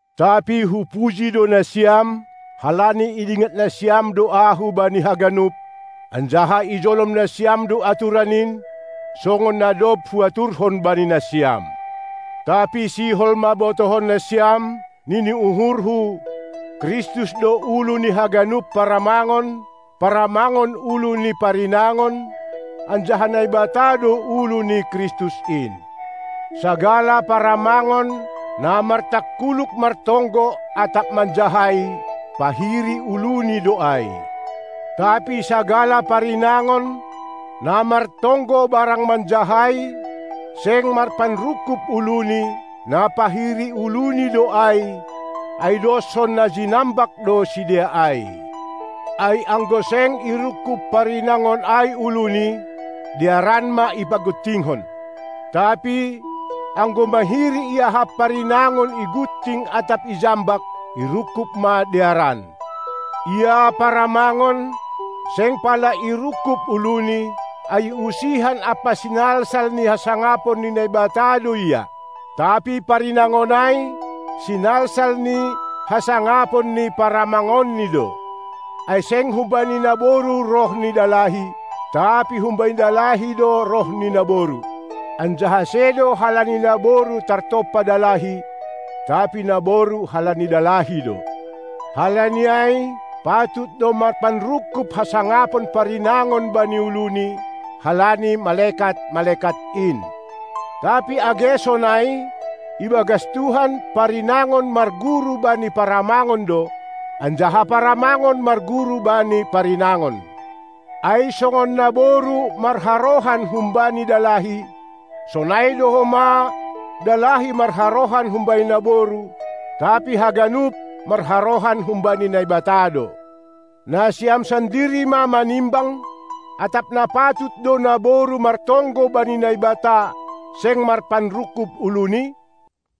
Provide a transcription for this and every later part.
Tapi hupuji do nasiam, halani idingat nasiam do ahu bani haganup, anjaha ijolom nasiam do aturan in, songon na dob huaturhon bani nasiam. Tapi sihol ma botohon nasiam, nini uhurhu: Kristus do ulu ni haganup paramangon, paramangon ulu ni parinangon, anjaha Naibata do ulu ni Kristus in. Sagala paramangon, na martangkuluk martonggo atap manjahai, pahiri uluni do ai. Tapi sagala parinangon, na martonggo barang manjahai, seng marpanrungkub uluni, na pahiri uluni do ai, ai doshon na jinambak do sidea ai. Ai anggo seng irungkub parinangon ai uluni, dearan ma ipaguntingkon. Tapi, anggo mahiri iahap parinangon igunting atap ijambak, irungkub ma dearan. Ia paramangon, seng pala irungkub uluni, ai usihan ampa sinalsal ni hasangapon ni Naibata do ia. Tapi parinangon ai, sinalsal ni hasangapon ni paramangonni do. Ai seng humbani naboru roh ni dalahi, tapi humbani dalahi do roh ni naboru. Anjaha sedo halani naboru tartompa dalahi, tapi naboru halani dalahi do. Halani ai, patut do marpanrungkub hasangapon parinangon bani uluni, halani malekat-malekat in. Tapi age sonai, ibagas Tuhan parinangon marguru bani paramangon do, anjaha paramangon marguru bani parinangon. Ai songon naboru marharohan humbani dalahi, sonai do homa dalahi marharohan humbani naboru; tapi haganup marharohan humbani Naibata do. Nasiam sandiri ma manimbang, atap na patut do naboru martonggo bani Naibata, seng marpanrungkub uluni?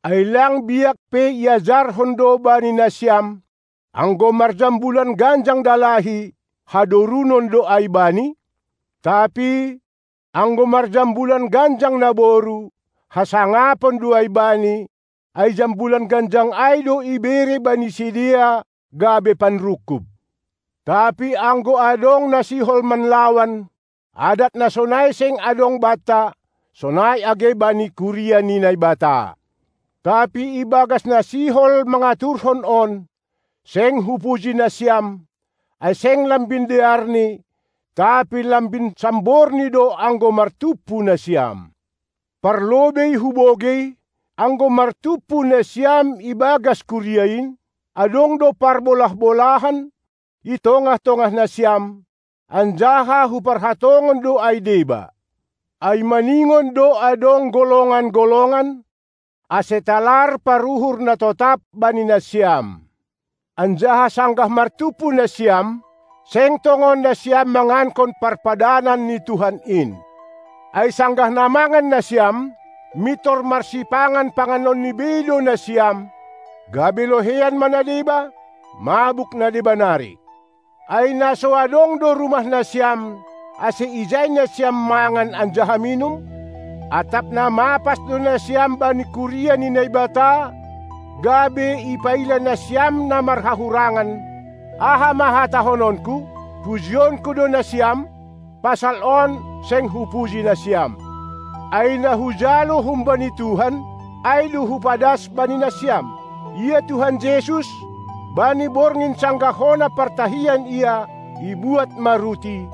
Ai lang biak pe iajarhon do bani nasiam, anggo marjambulan ganjang dalahi, hadorunon do ai bani? Tapi anggo marjambulan ganjang naboru, hasangapon do ai bani, ai jambulan ganjang ai do ibere bani sidea gabe panrungkub. Tapi anggo adong na sihol manlawan, adat na sonai seng adong banta, sonai age bani kuria ni Naibata. Tapi ibagas na sihol mangaturhon on, seng hupuji nasiam, ai seng lambin dearni, tapi lambin samborni do anggo martumpu nasiam. Parlobei hubogei, anggo martumpu nasiam ibagas kuria in, adong do parbolah-bolahan i tongah-tongah nasiam, anjaha huparhatongon do ai deba. Ai maningon do adong golongan-golongan, ase talar paruhur na totap bani nasiam. Anjaha sanggah martumpu nasiam, seng tongon nasiam mangankon parpadanan ni Tuhan in. Ai sanggah na mangan nasiam, mintor marsipangan panganonni bei do nasiam, gabe loheian ma na deba, mabuk na deba nari. Ai na so adong do rumah nasiam, ase ijai nasiam mangan anjaha minum? Atap na mapas do nasiam bani kuria ni Naibata, gabe ipaila nasiam na marhahurangan? Aha ma hatahononku? Pujionku do nasiam? Pasal on seng hupuji nasiam. Ai na hujalo humbani Tuhan, ai do hupadas bani nasiam: Ia Tuhan Jesus, bani borngin sanggah hona partahian Ia, ibuat ma ruti,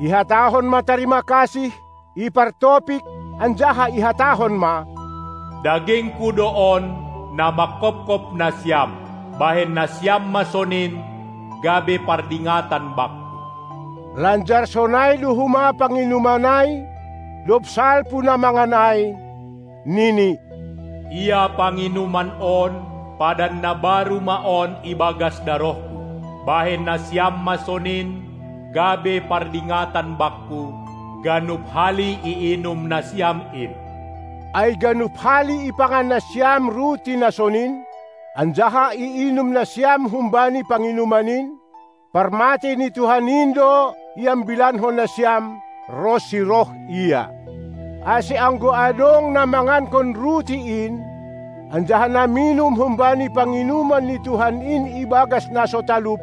ihatahon ma tarima kasih, ipartopik, anjaha ihatahon ma: DagingKu do on, na mangkopkop nasiam. Bahen nasiam ma sonin, gabe pardingatan Bakku! Lanjar sonai do homa panginuman ai dob salpu na mangan ai, nini: Ia panginuman on, padan na baru ma on ibagas darohKu. Bahen nasiam ma sonin, gabe pardingatan Bakku, ganup hali iinum nasiam in. Ai ganup hali ipangan nasiam ruti na sonin, anjaha iinum nasiam humbani panginuman in, parmatei ni Tuhan in do iambilankon nasiam, ronsi roh Ia. Ase anggo adong na mangankon ruti in, anjaha na minum humbani panginuman ni Tuhan in ibagas na so talup,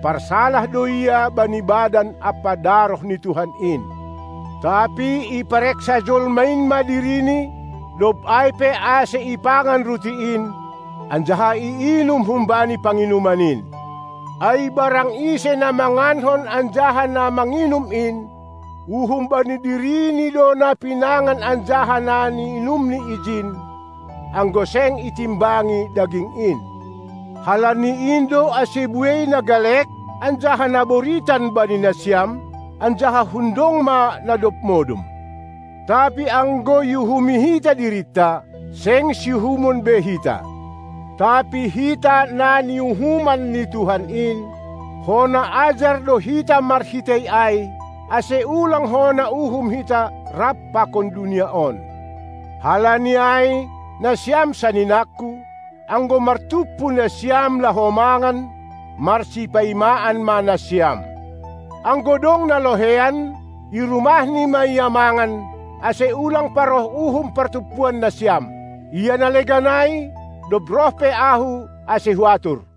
parsalah do ia bani badan ampa daroh ni Tuhan in. Tapi ipareksa jolma in ma dirini, dob ai pe ase ipangan ruti in, anjaha iinum humbani panginuman in. Ai barang ise na mangankon anjaha na manginum in, uhum bani dirini do na pinangan anjaha na niinumni ijin, anggo seng itimbangi daging in. Halani in do ase buei na galek anjaha na boritan bani nasiam, anjaha hundong ma na dob modom. Tapi anggo iuhumi hita dirinta, seng siuhumon be hita. Tapi hita na niuhuman ni Tuhan in, hona ajar do hita marhitei ai, ase ulang hona uhum hita rap pakon dunia on. Halani ai, nasiam saninangku, anggo martumpu nasiam laho mangan, marsipaimaan ma nasiam. Anggo dong na loheian, i rumahni ma ia mangan, ase ulang paroh uhum partumpuan nasiam. Ia na legan ai, dob roh pe ahu ase huatur.